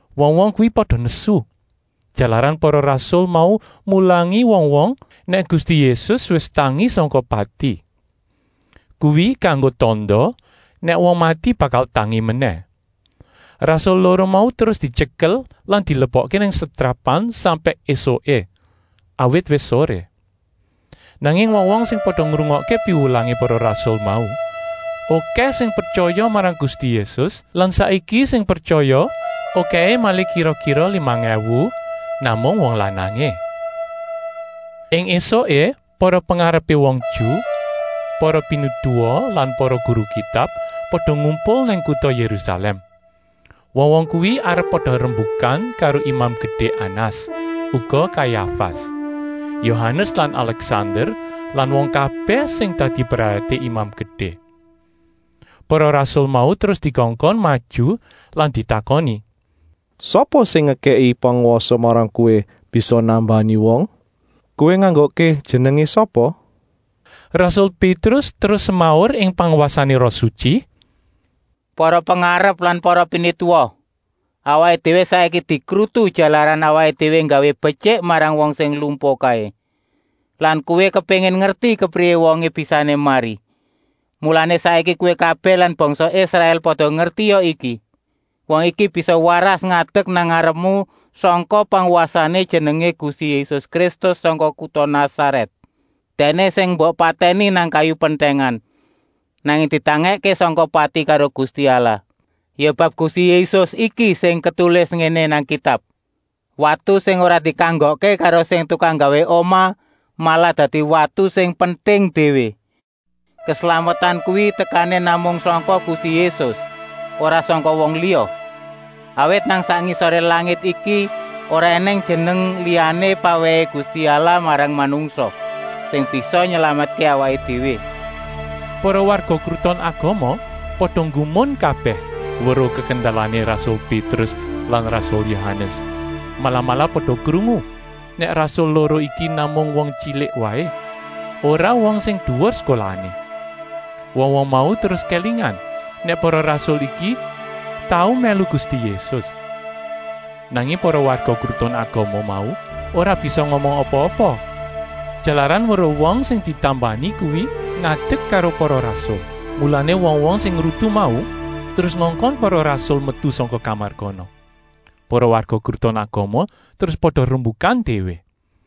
Wong-wong kuwi pada nesu, jalaran para rasul mau mulangi wong-wong nèk Gusti Yésus wis tangi sangka pati. Kuwi kanggo tanda nèk wong mati bakal tangi menèh. Rasul loro mau terus dityekel lan dilebokké nang setrapan sampèk ésuké, awit wis soré. Nanging wong-wong sing pada ngrungokké piwulangé para rasul mau okèh sing pretyaya marang Gusti Yésus lan saiki sing pretyaya okèhé malih kira-kira limang èwu, namung wong lanangé. Ing ésuké para pengarepé wong Ju, para pinituwa lan para guru Kitab pada ngumpul nang kuta Yérusalèm. Wong-wong kuwi arep pada rembukan karo Imam Gedé Anas, uga Kayafas, Yohanes lan Alèksander lan wong kabèh sing dadi brayaté Imam Gedé. Para rasul mau terus dikongkon maju lan ditakoni: “Sapa sing ngekèki pangwasa marang kowé bisa nambani wong? Kowé nganggokké jenengé sapa?” Rasul Pétrus terus semaur ing pangwasané Roh Sutyi: “Para pengarep lan para pinituwa! Awaké déwé saiki dikrutu jalaran awaké déwé nggawé betyik marang wong sing lumpuh kaé. Lan kowé kepéngin ngerti kepriyé wongé bisané mari! Mulané, saiki kowé kabèh lan bangsa Israèl pada ngertia iki: wong iki bisa waras ngadek nang ngarepmu sangka pangwasané Jenengé Gusti Yésus Kristus sangka kuta Nasarèt. Dèkné sing mbok patèni nang kayu pentèngan, nanging ditangèkké sangka pati karo Gusti Allah. Ya bab Gusti Yésus iki sing ketulis ngéné nang Kitab: ‘Watu sing ora dikanggokké karo sing tukang nggawé omah malah dadi watu sing penting déwé.’ Keslametan kuwi tekané namung sangka Gusti Yésus, ora sangka wong liya. Awit nang sak ngisoré langit iki ora ènèng jeneng liyané pawèhé Gusti Allah marang manungsa, sing bisa nylametké awaké déwé.” Para warga Kruton Agama pada nggumun kabèh weruh kekendelané rasul Pétrus lan rasul Yohanes, malah-malah pada krungu nèk rasul loro iki namung wong tyilik waé, ora wong sing duwur sekolahané. Wong-wong mau terus kélingan nèk para rasul iki tau mèlu Gusti Yésus. Nanging para warga Kruton Agama mau ora bisa ngomong apa-apa, jalaran weruh wong sing ditambani kuwi ngadek karo para rasul. Mulané wong-wong sing ngrutu mau terus ngongkon para rasul metu sangka kamar kono. Para warga Kruton Agama terus pada rembukan déwé.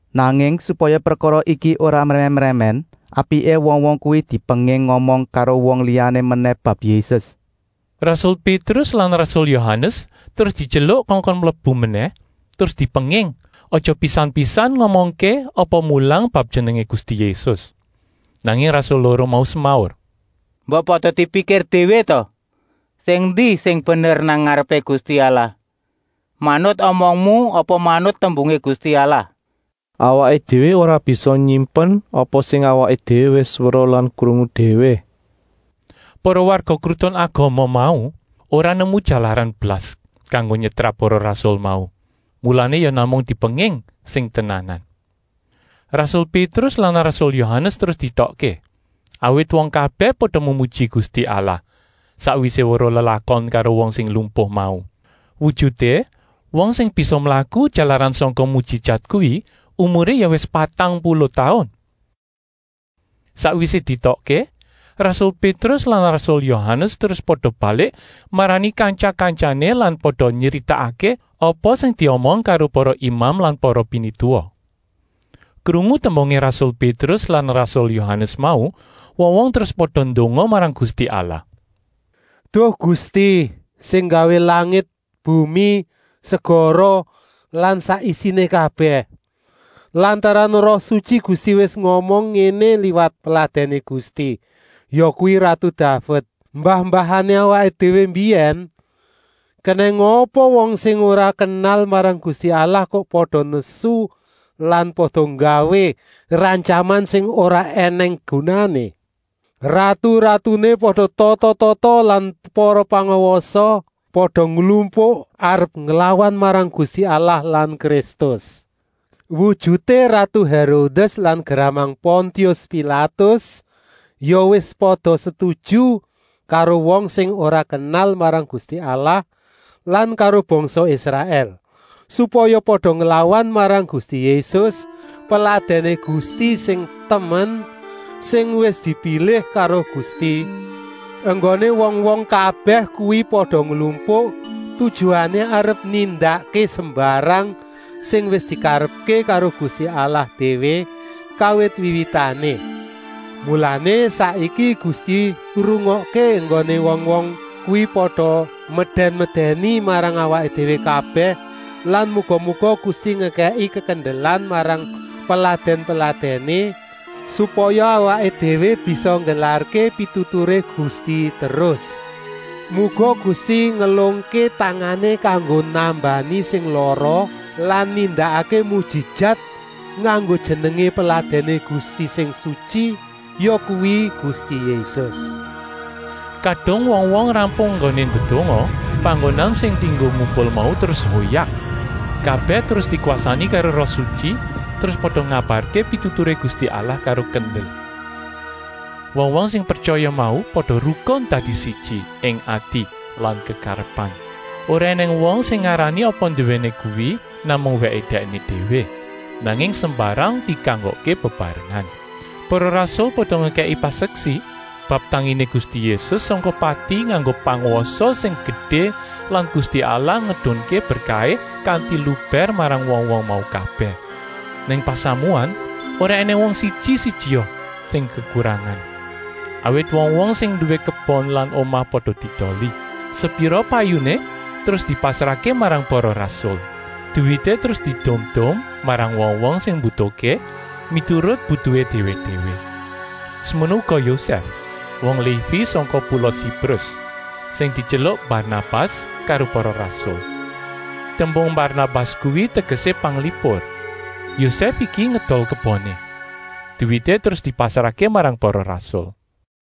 Nanging supaya prekara iki ora mrèmèn-mrèmèn, apiké wong-wong kuwi dipenging ngomong karo wong liyané menèh bab Yésus.” Rasul Pétrus lan rasul Yohanes terus dityeluk kongkon mlebu menèh terus dipenging aja pisan-pisan ngomongké apa mulang bab Jenengé Gusti Yésus. Nanging rasul loro mau semaur: “Mbok pada dipikir déwé ta? Sing endi sing bener nang ngarepé Gusti Allah: manut omongmu apa manut tembungé Gusti Allah? Awaké déwé ora bisa nyimpen apa sing awaké déwé wis weruh lan krungu déwé.” Para warga Kruton Agama mau ora nemu jalaran blas kanggo nyetrap para rasul mau, mulané ya namung dipenging sing tenanan. Rasul Pétrus lan rasul Yohanes terus dietokké, awit wong kabèh pada memuji Gusti Allah, sakwisé weruh lelakon karo wong sing lumpuh mau. Wujuté wong sing bisa mlaku jalaran sangka mujijat kuwi umuré ya wis patang puluh taun. Sakwisé dietokké, rasul Pétrus lan rasul Yohanes terus pada balik marani kantya-kantyané lan pada nyritakké apa sing diomong karo para imam lan para pinituwa. Krungu tembungé rasul Pétrus lan rasul Yohanes mau, wong-wong terus pada ndonga marang Gusti Allah: “Duh Gusti sing nggawé langit, bumi, segara, lan sak isiné kabèh! Lantaran Roh Sutyi Gusti wis ngomong ngéné liwat peladèné Gusti, yakuwi ratu Daved, mbah-mbahané awaké déwé mbiyèn: ‘Kenèng apa wong sing ora kenal marang Gusti Allah kok pada nesu lan pada nggawé rantyaman sing ora ènèng gunané? Ratu-ratuné pada tata-tata lan para pangwasa pada nglumpuk arep nglawan marang Gusti Allah lan Kristus.’ Wujuté ratu Hérodès lan gramang Pontius Pilatus ya wis pada setuju karo wong sing ora kenal marang Gusti Allah lan karo bangsa Israèl, supaya pada nglawan marang Gusti Yésus, Peladèné Gusti sing temen, sing wis dipilih karo Gusti. Enggoné wong-wong kabèh kuwi pada nglumpuk, tujuané arep nindakké sembarang sing wis dikarepké karo Gusti déwé kawit wiwitané. Mulané saiki Gusti, rungokké enggoné wong-wong kuwi pada medèn-medèni marang awaké déwé kabèh lan muga-muga Gusti ngekèki kekendelan marang peladèn-peladèné, supaya awaké déwé bisa nggelarké pituturé Gusti terus. Muga Gusti ngelungké tangané kanggo nambani sing lara lan nindakké mujijat nganggo jenengé Peladèné Gusti sing sutyi, yakuwi Gusti Yésus.” Kadung wong-wong rampung enggoné ndedonga, panggonan sing dienggo ngumpul mau terus hoyak. Kabèh terus dikwasani karo Roh Sutyi terus pada ngabarké pituturé Gusti Allah karo kendel. Wong-wong sing pretyaya mau pada rukun dadi siji ing ati lan kekarepan. Ora ènèng wong sing ngarani apa nduwéné kuwi namung wèké dèkné déwé, nanging sembarang dikanggokké bebarengan. Para rasul pada ngekèki paseksi bab tanginé Gusti Yésus sangka pati nganggo pangwasa sing gedé lan Gusti Allah ngedunké berkahé kanti lubèr marang wong-wong mau kabèh. Nang pasamuan ora ènèng wong siji-sijia sing kekurangan, awit wong-wong sing nduwé kebon lan omah pada diedoli. Sepira payuné terus dipasrahké marang para rasul. Duwité terus diedum-edum marang wong-wong sing mbutuhké, miturut butuhé déwé-déwé. Semono uga Yosèf, wong Lévi sangka pula Siprus, sing dityeluk Barnabas karo para rasul. Tembung Barnabas kuwi tegesé panglipur. Yosèf iki ngedol keboné. Duwité terus dipasrahké marang para rasul.